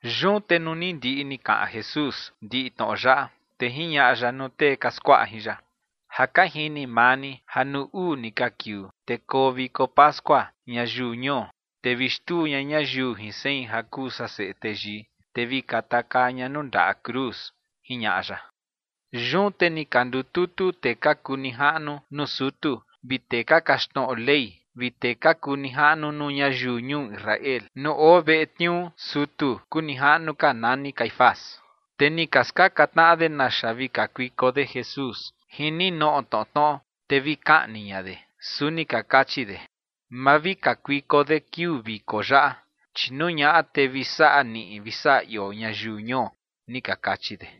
Yun te nuu ni ndiꞌi ni kaꞌan Jesús ndiꞌi tnoꞌo yaꞌa, te jiñaꞌa ya nuu tee ka skuaꞌa jin ya: ͏―͏Ja ka jini maa ni ja nuu uu ni ka kiuu, te koo viko pascua ñayiu ñuo, te vi xtuu ña ñayiu jin sein ja kuu san Seꞌe Teyii, te vi katakaa ña nuu ndaꞌa cruz ͏―͏jiñaꞌa ya. Yun te ni ka ndututu tee ka kuu nijaꞌnu nuu sutu vi tee ka kaxtnoꞌo Ley vi tee ka kuu nijaꞌnu nuu ñayiu ñuu Israel nuu oo veꞌe tniuu sutu kuu nijaꞌnu ka nani Caifás. Te ni ka skaꞌan tnaꞌa de naxa vi kakuiko de Jesús jin ninoꞌo tnoꞌo tnoꞌo, te vi kaꞌni ña de. Su ni ka kachi de: ͏―͏Ma vi kakuiko de kiuu viko yaꞌa, chi nuu ñaꞌa, te vi saꞌa niꞌi vi saꞌa ioo ñayiu ñuo ͏―͏ni ka kachi de.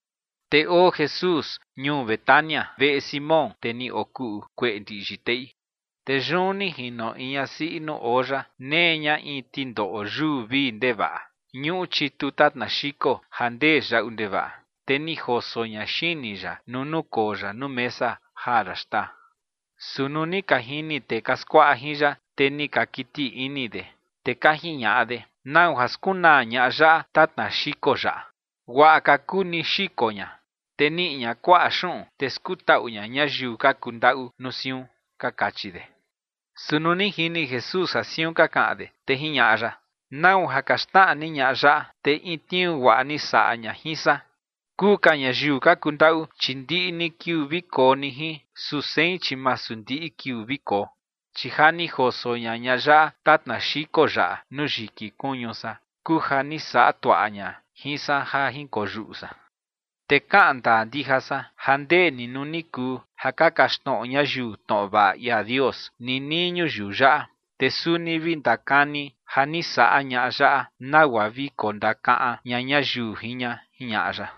Te oo Jesús ñuu Betania, veꞌe Simón, tee ni okuꞌu kueꞌe ndiꞌyi teꞌi. Te yun ni jino in ñasiꞌi nuu oo ya, nee ña in tindoꞌo yuu vii ndevaꞌa ñuꞌu chitu tatna xiko ja ndee yaꞌu ndevaꞌa. Te ni joso ña xini ya nuu nukoo ya nuu mesa jaa ya xtaa. Su nuu ni ka jini tee ka skuaꞌa jin ya, te ni ka kiti ini de, te ka jiñaꞌa de: ͏―͏¿Nau ja skunaa ñaꞌa yaꞌa tatna xiko yaꞌa? Guaꞌa ka kuu ni xiko ña, te niꞌi ña kuaꞌa xuꞌun, te skutaꞌu ña ñayiu ka kuu ndaꞌu nuu siun ͏―͏ka kachi de. Su nuu ni jini Jesús ja siun ka kaꞌan de, te jiñaꞌa ya: ͏―͏¿Nau ja ka xnaꞌa ni ñaꞌa yaꞌa? Te in tniuu guaꞌa ni saꞌa ña jin san. Kuu ka ñayiu ka kundaꞌu, chi ndiꞌi ni kiuu ni vi koo ni jin, su sein, chi masu ndiꞌi kiuu vi koo. Chi ja ni joso ña ñaꞌa yaꞌa tatna xiko yaꞌa nuu yiki kuñu san kuu ja ni saꞌa tuaꞌa ña jin san ja jinkoyuꞌu san. Te kaꞌan ndaa ndija san ja ndee ni nuu ni kuu ja ka kaxtnoꞌo ñayiu tnoꞌo vaꞌa ia Dios ninii ñuyiu yaꞌa, te suni vi ndakani ja ni saꞌa ñaꞌa yaꞌa nagua vi kondakaꞌan ña ñayiu jin ña ͏―͏jiñaꞌa ya.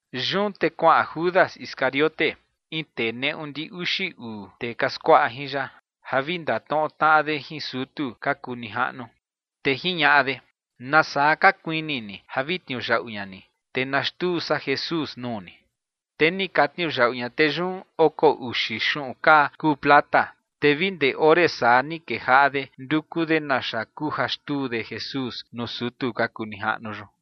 Yun te kuaꞌan Judas Iscariote, in tee neꞌu ndi uxi uu tee ka skuaꞌa jin ya, ja vi ndatnoꞌo tnaꞌa de jin sutu ka kuu nijaꞌnu. Te jiñaꞌa de: ͏―͏¿Nasaa ka kuini ni ja vi tniuyaꞌu ña ni, te na xtuu san Jesús nuu ni? Te ni ka tniuyaꞌu ña tee yun oko uxi xuꞌun kaa kuu plata. Te vi ndee ore saa ni kejaꞌa de nduku de naxa kuu ja xtuu de Jesús nuu sutu ka kuu nijaꞌnu yun.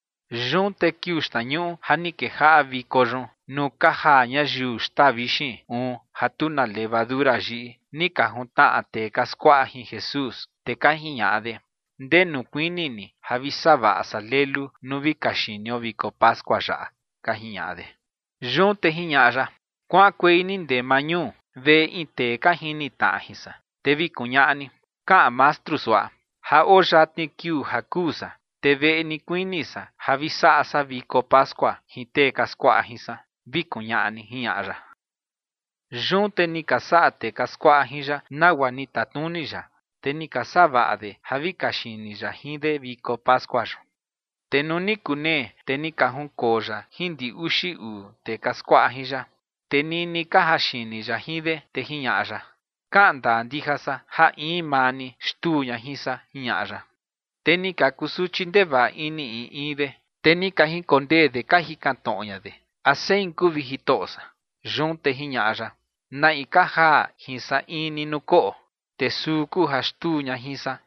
Yun te kiuu xtnañuꞌu ja ni kejaꞌa viko yun nuu ka jaa ñayiu xtaa vixin uun ja tu na levadura yiꞌi, ni ka juntnaꞌa tee ka skuaꞌa jin Jesús, te ka jiñaꞌa de: ͏―͏¿Ndenu kuini ni ja vi savaꞌa san lelu nuu vi kaxinio viko pascua yaꞌa? ͏―͏ka jiñaꞌa de. Yun te jiñaꞌa ya: ͏―͏Kuaꞌankuei ni ndee maa ñuu, veꞌe in tee ka jini tnaꞌa jin san, te vi kuñaꞌa ni: “Kaꞌan Mastru suaꞌa: Ja oo yatni kiuu ja kuu san, te veꞌe ni kuini san ja vi saꞌa san viko pascua jin tee ka skuaꞌa jin san”, vi kuñaꞌa ni ͏―͏jiñaꞌa ya. Yun te ni ka saꞌa tee ka skuaꞌa jin ya nagua ni tatnuni ya, te ni ka savaꞌa de ja vi kaxini ya jin de viko pascua yun. Te nuu ni kunee, te ni ka junkoo ya jin ndi uxi uu tee ka skuaꞌa jin ya. Te nini ka jaxini ya jin de, te jiñaꞌa ya: ͏―͏Kaꞌan ndaa ndija san ja in maa ni xtuu ña jin san ͏―͏jiñaꞌa ya. Te ni ka kusuchi ndevaꞌa ini in in de, te ni ka jinkondee de ka jikan tnoꞌo ña de: ͏―͏¿A sein kuu, vi Jitoꞌo san? Yun te jiñaꞌa ya: ͏―͏Na in ka jaa jin san in ni nuu koꞌo, te suu kuu ja xtuu ña jin san.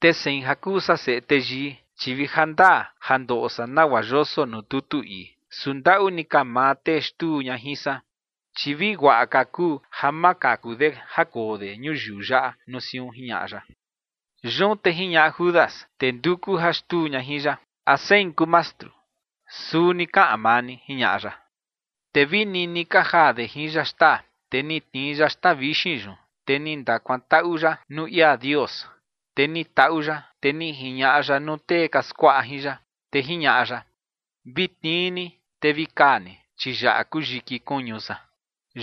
Te sein ja kuu san Seꞌe Teyii, chi vi ja ndaa ja ndoꞌo san nagua yoso nuu tutu ii. Su ndaꞌu ni ka maa tee xtuu ña jin san, chi vi guaꞌa ka kuu ja ma kaku de ja koo de ñuyiu yaꞌa nuu siun ͏―͏jiñaꞌa ya. Yun te jiñaꞌa Judas, tee nduku ja xtuu ña jin ya: ͏―͏¿A sein kuu, Mastru? ͏―͏Suu ni kaꞌan maa ni ͏―͏jiñaꞌa ya. Te vi nini ka jaa de jin ya xtaa, te ni tnii ya xtaa vixin yun, te ni ndakuantaꞌu ya nuu ia Dios, te ni taꞌu ya, te ni jiñaꞌa ya nuu tee ka skuaꞌa jin ya, te jiñaꞌa ya: ͏―͏Vi tnii ni te vi kaa ni, chi yaꞌa kuu yiki kuñu san.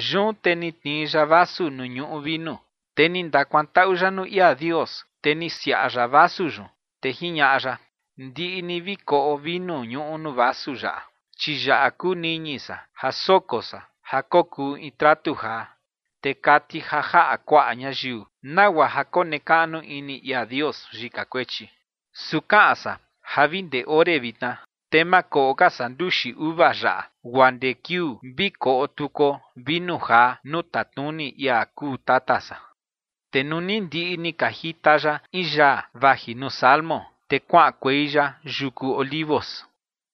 Yun te ni tnii ya vasu nuu ñuꞌu vinu, te ni ndakuantaꞌu ya nuu ia Dios, te ni siaꞌa ya vasu yun, te jiñaꞌa ya: ͏―͏Ndiꞌi ni vi koꞌo vinu ñuꞌu nuu vasu yaꞌa. Chi yaꞌa kuu niñi san ja soko san ja kokuu in tratu jaa, te kati ja jaꞌa kuaꞌa ñayiu nagua ja konekaꞌnu ini ia Dios yika kuechi. Su kaꞌan san ja vi ndee ore vitna, te ma koꞌo ka san nduxi uva yaꞌa guaa ndee kiuu vi koꞌo tukuo vinu jaa nuu tatnuni ia kuu Tata san. Te nuu ni ndiꞌi ni ka jita ya in yaa vaji nuu Salmo, te kuaꞌankuei ya yuku Olivos.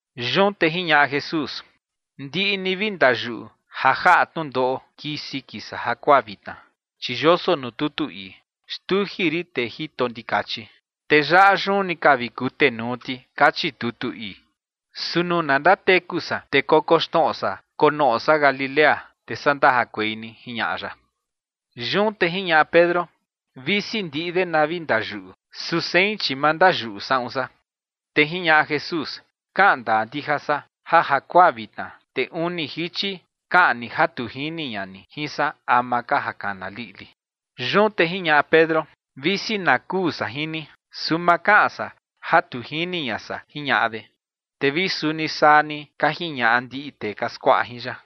Yun te jiñaꞌa Jesús: ͏―͏Ndiꞌi ni vi ndayuꞌu ja jaꞌa tnundoꞌo kii siki san jakuaa vitna, chi yoso nuu tutu ii: “Xtuji rin tee jito ndikachi, te yaꞌa yun ni ka vi kutenuu ti”, kachi tutu ii. Su nuu na ndateku san, te kokoxnoꞌo san konoꞌo san Galilea, te saa ndajakuei ni ͏―͏jiñaꞌa ya. Yun te jiñaꞌa Pedro: ͏―͏Visi ndiꞌi de na vi ndayuꞌu, su sein, chi ma ndayuꞌu saꞌun san. Te jiñaꞌa Jesús: ͏―͏Kaꞌan ndaa ndija san ja jakuaa vitna, te uni jichi kaꞌan ni ja tu jini ña ni jin san ama ka ja kana liꞌli. Yun te jiñaꞌa Pedro: ͏―͏Visi na kuu san jin ni, su ma kaꞌan san ja tu jini ña san ͏―͏jiñaꞌa de. Te vi suni saa ni ka jiñaꞌa ndiꞌi tee ka skuaꞌa jin ya.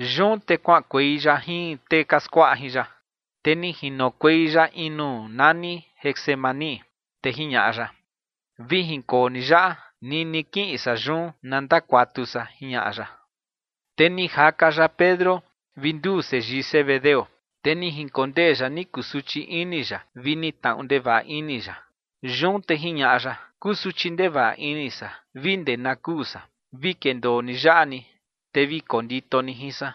Yun te kuaꞌankuei ya jin tee ka skuaꞌa jin ya, te ni jinokuei ya in nuu nani Getsemaní, te jiñaꞌa ya: ͏―͏Vi jinkoo ni yaꞌa nini kiꞌin san yun na ndakuatu san ͏―͏jiñaꞌa ya. Te ni jaka ya Pedro vi nduu seyii Zebedeo, te ni jinkondee ya ni kusuchi ini ya vi ni tnaꞌu ndevaꞌa ini ya. Yun te jiñaꞌa ya: ͏―͏Kusuchi ndevaꞌa ini san vi ndee na kuu san. Vi kendoo ni yaꞌa ni, te vi kondito ni jin san.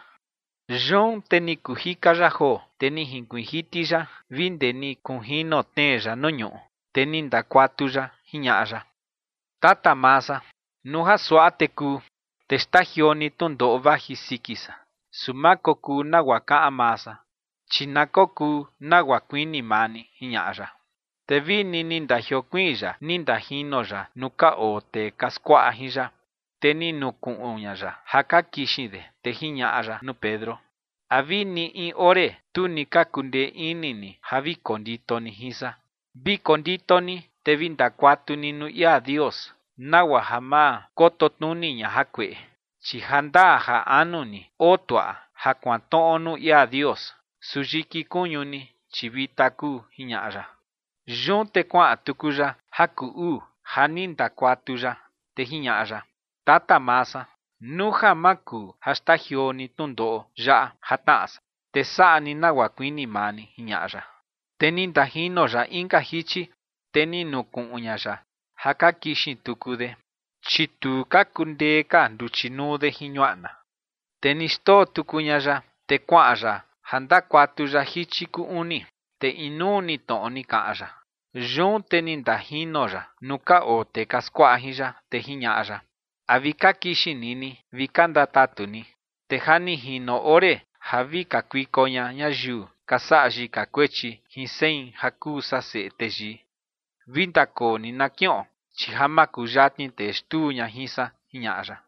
Yun te ni kuu jika ya joo, te ni jinkuiin jiti ya vi ndee ni kunjino tnee ya nuu ñuꞌu, te ni ndakuatu ya, jiñaꞌa ya: ͏―͏Tata maa san, nuu ja suaꞌa te kuu, te xtajioo ni tnundoꞌo vaji siki san. Su ma kokuu nagua kaꞌan maa san, chi na kokuu nagua kuini maa ni ͏―͏jiñaꞌa ya. Te vini ni ndajiokuiin ya ni ndajino ya nuu ka oo tee ka skuaꞌa jin ya, te ni nukuꞌun ña ya ja ka kixin de. Te jiñaꞌa ya nuu Pedro: ͏―͏¿A vini in ore, tu ni ka kundee ini ni ja vi kondito ni jin san? Vi kondito ni, te vi ndakuatu ni nuu ia Dios nagua ja ma koto tnuni ña jakueꞌe, chi ja ndaa ja anu ni oo tuaꞌa ja kuantnoꞌo nuu ia Dios, su yiki kuñu ni, chi vita kuu ͏―͏jiñaꞌa ya. Yun te kuaꞌan tuku ya ja kuu uu ja ni ndakuatu ya, te jiñaꞌa ya: ͏―͏Tata maa san, nuu ja ma kuu ja xtajioo ni tnundoꞌo yaꞌa ja tnaꞌa san, te saꞌa ni nagua kuini maa ni ͏―͏jiñaꞌa ya. Te ni ndajino ya inka jichi, te ni nukuꞌun ña ya ja ka kixin tuku de, chi tu ka kundee ka nduchi nuu de jin ñuaꞌna. Te ni xndoo tuku ña ya, te kuaꞌan ya ja ndakuatu ya jichi kuu uni, te inuu ni tnoꞌo ni kaꞌan ya. Yun te ni ndajino ya nuu ka oo tee ka skuaꞌa jin ya, te jiñaꞌa ya: ͏―͏¿A vi ka kixin ni ni vi ka ndatatu ni? Te ja ni jino ore ja vi kakuiko ña ñayiu ka saꞌa yika kuechi jin sein ja kuu san Seꞌe Teyii. Vi ndakoo ni na kiꞌon, chi ja makuyatni tee xtuu ña jin san ͏―͏jiñaꞌa ya.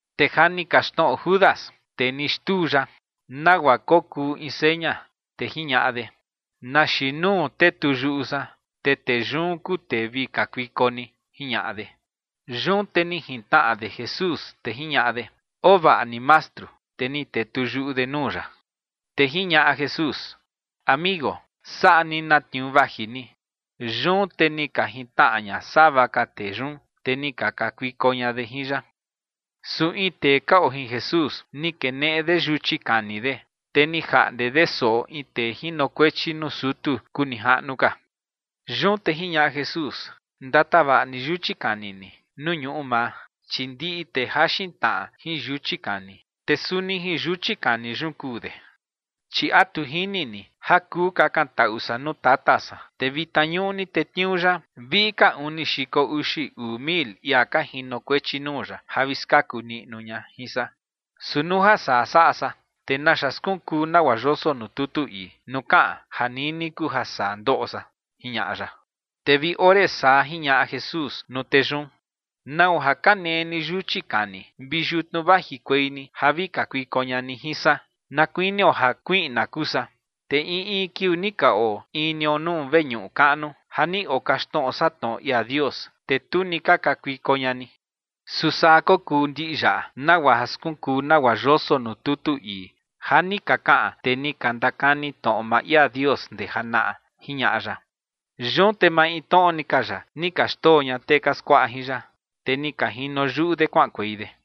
Te ja ni kaxtnoꞌo Judas, tee ni xtuu ya, nagua kokuu in seña, te jiñaꞌa de: ͏―͏Na xiin nuu tetuyuꞌu san, te tee yun kuu tee vi kakuiko ni ͏―͏jiñaꞌa de. Yun te ni jintnaꞌa de Jesús, te jiñaꞌa de: ͏―͏Oo vaꞌa ni, Mastru. Te ni tetuyuꞌu de nuu ya. Te jiñaꞌa Jesús: ͏―͏Amigo, saꞌa ni na tniuu vaji ni. Yun te ni ka jintnaꞌa ña sava ka tee yun, te ni ka kakuiko ña de jin ya. Su in tee ka oo jin Jesús, ni keneꞌe de yuchi kani de, te ni jaꞌnde de soꞌo in tee jinokuechi nuu sutu kuu nijaꞌnu ka. Yun te jiñaꞌa Jesús: ͏―͏Ndatavaꞌa ni yuchi kani ni nuu ñuꞌu maa, chi ndiꞌi tee jaxin tnaꞌa jin yuchi kani, te suni jin yuchi kani yun kuu de. ¿Chi a tu jini ni ja kuu kakantaꞌu san nuu Tata san, te vitna ñuꞌni tetniuu ya viꞌi ka uni xiko uxi uu mil ia ka jinokuechi nuu ya ja vi skaku niꞌnu ña jin san? Su nuu ja saa saꞌa san, ¿te naxa skunkuu nagua yoso nuu tutu ii nuu kaꞌan ja nini kuu ja saa ndoꞌo san? ͏―͏jiñaꞌa ya. Te vi ore saa jiñaꞌa Jesús nuu tee yun: ͏―͏¿Nau ja ka nee ni yuchi kani vi yutnu vajikuei ni ja vi kakuiko ña ni jin san na kuinio ja kuiꞌna kuu san? Te in in kiuu ni ka oo in nio nuu veñuꞌu kaꞌnu ja ni okaxtnoꞌo san tnoꞌo ia Dios, te tu ni ka kakuiko ña ni. Su saa kokuu ndiꞌi yaꞌa, nagua ja skunkuu nagua yoso nuu tutu ii ja ni ka kaꞌan tee ni ka ndakani tnoꞌo maa ia Dios ndee janaꞌa ͏―͏jiñaꞌa ya. Yun te maintnoꞌo ni ka ya, ni ka xndoo ña tee ka skuaꞌa jin ya, te ni ka jino yuꞌu de kuaꞌankuei de.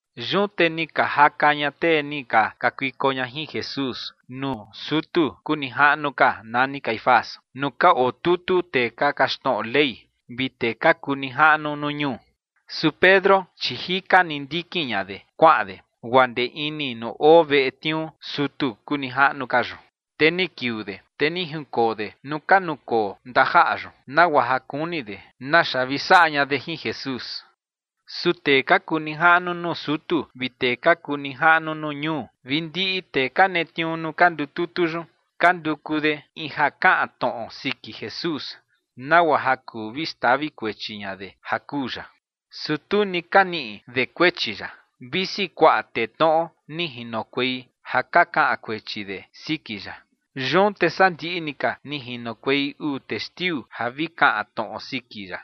Yun te ni ka jaka ña tee ni ka kakuiko ña jin Jesús nuu sutu kuu nijaꞌnu ka nani Caifás nuu ka otutu tee ka kaxtnoꞌo Ley vi tee ka kuu nijaꞌnu nuu ñuu. Su Pedro, chi jika ni ndikin ña de kuaꞌan de guaa ndee ini nuu oo veꞌe tniuu sutu kuu nijaꞌnu ka yun. Te ni kiuu de, te ni jinkoo de nuu ka nukoo ndajaꞌa yun, nagua ja kuni de naxa vi saꞌa ña de jin Jesús. Su tee ka kuu nijaꞌnu nuu sutu vi tee ka kuu nijaꞌnu nuu ñuu vi ndiꞌi tee ka netniuu nuu ka ndututu yun, ka nduku de in ja kaꞌan tnoꞌo siki Jesús, nagua ja kuu vi xtavi kuechi ña de ja kuu ya. Su tu ni ka niꞌi de kuechi ya, visi kuaꞌa tee tnoꞌo ni jinokuei ja ka kaꞌan kuechi de siki ya. Yun te saa ndiꞌi ni ka, ni jinokuei uu testiu ja vi kaꞌan tnoꞌo siki ya.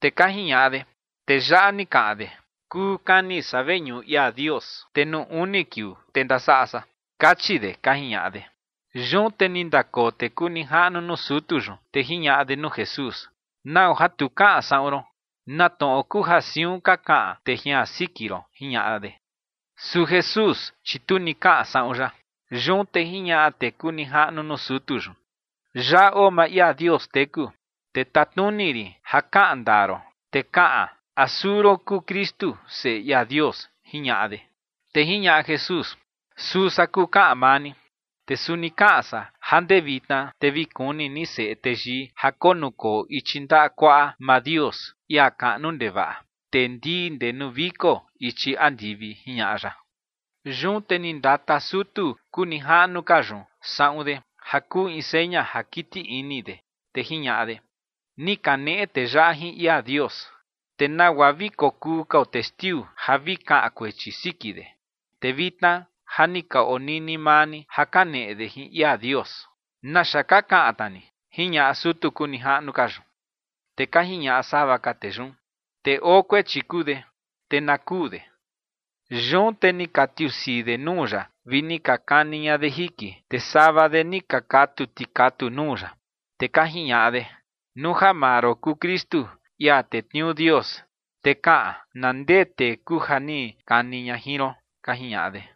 Te ka jiñaꞌa de: ͏―͏Tee yaꞌa ni kaꞌan de: “Kuu kani san veñuꞌu ia Dios, te nuu uni kiuu, te ndasaꞌa san”, kachi de ͏―͏ka jiñaꞌa de. Yun te ni ndakoo tee kuu nijaꞌnu nuu sutu yun, te jiñaꞌa de nuu Jesús: ͏―͏¿Nau ja tu kaꞌan saꞌun ron? ¿Na tnoꞌo kuu ja siun ka kaꞌan tee jian siki ron? ͏―͏jiñaꞌa de. Su Jesús, chi tu ni kaꞌan saꞌun ya. Yun te jiñaꞌa tee kuu nijaꞌnu nuu sutu yun: ͏―͏Yaꞌa oo maa ia Dios teku, te tatnuni rin ja kaꞌan ndaa ron, te kaꞌan a suu ron kuu Kristu, Seꞌe ia Dios ͏―͏jiñaꞌa de. Te jiñaꞌa Jesús: ͏―͏Suu san kuu kaꞌan maa ni. Te suni kaꞌan san ja ndee vitna, te vi kuni ni Seꞌe Teyii ja konukoo ichi ndaꞌa kuaꞌa maa Dios, ia kaꞌnu ndevaꞌa, te ndii ndee nuu viko ichi andivi ͏―͏jiñaꞌa ya. Yun te ni ndata sutu kuu nijaꞌnu ka yun saꞌun de, ja kuu in seña ja kiti ini de, te jiñaꞌa de: ͏―͏Ni kaneꞌe tee yaꞌa jin ia Dios. ¿Te nagua vi kokuu kao testiu ja vi kaꞌan kuechi siki de? Te vitna ja ni ka onini maa ni ja kaneꞌe de jin ia Dios. ¿Naxa ka kaꞌan tna ni? ͏―͏jiñaꞌa sutu kuu nijaꞌnu ka yun. Te ka jiñaꞌa sava ka tee yun: ͏―͏Tee oo kuechi kuu de, te na kuu de. Yun te ni ka tiusii de nuu ya vi ni ka kani ña de jiki, te sava de ni ka katu tikatu nuu ya. Te ka jiñaꞌa de: ͏―͏Nuu ja maa ron kuu Kristu, ia netniuu Dios, te kaꞌan, na ndee tee kuu ja ni kani ña jin ron ͏―͏ka jiñaꞌa de.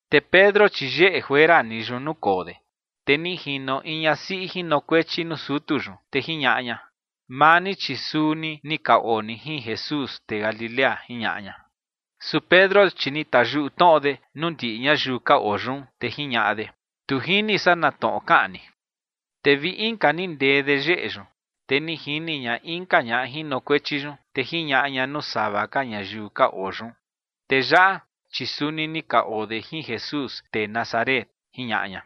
Te Pedro, chi yeꞌe juera ni yun nukoo de. Te ni jino in ñasiꞌi jinokuechi nuu sutu yun, te jiñaꞌa ña: ͏―͏Maa ni, chi suni ni ka oo ni jin Jesús, tee Galilea ͏―͏jiñaꞌa ña. Su Pedro, chi ni tayuꞌu tnoꞌo de nuu ndiꞌi ñayiu ka oo yun, te jiñaꞌa de: ―Tu jini san na tnoꞌo kaꞌan ni. Te vi inka ni ndee de yeꞌe yun, te ni jini ña inka ñaꞌa jinokuechi yun, te jiñaꞌa ña nuu sava ka ñayiu ka oo yun: ͏―͏Tee yaꞌa, chi suni ni ka oo de jin Jesús, tee Nazaret ͏―͏jiñaꞌa ña.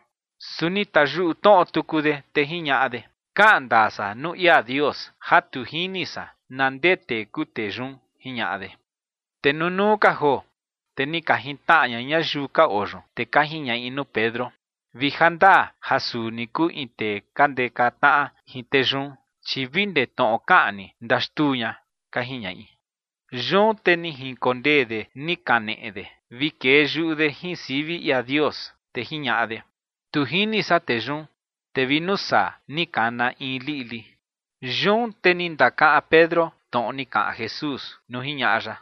Su ni tayuꞌu tnoꞌo tuku de, te jiñaꞌa de: ͏―͏Kaꞌan ndaa san nuu ia Dios ja tu jini san na ndee tee kuu tee yun ͏―͏jiñaꞌa de. Te nunuu ka joo, te ni ka jintnaꞌa ña ñayiu ka oo yun, te ka jiñaꞌi nuu Pedro: ͏―͏Vi ja ndaa ja suu ni kuu in tee ka ndeka tnaꞌa jin tee yun, chi vi ndee tnoꞌo kaꞌan ni ndaxtuu ña ͏―͏ka jiñaꞌi. Yun te ni jinkondee de ni kaneꞌe de vi kee yuꞌu de jin sivi ia Dios, te jiñaꞌa de: ͏―͏Tu jini san tee yun. Te vi nuu saa ni kana in liꞌli. Yun te ni ndakaꞌan Pedro tnoꞌo ni kaꞌan Jesús nuu jiñaꞌa ya: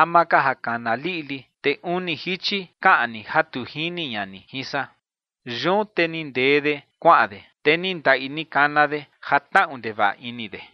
“Ama ka ja kana liꞌli, te uni jichi kaꞌan ni ja tu jini ña ni jin san”. Yun te ni ndee de kuaꞌan de, te ni ndaꞌi ni kana de ja tnaꞌu ndevaꞌa ini de.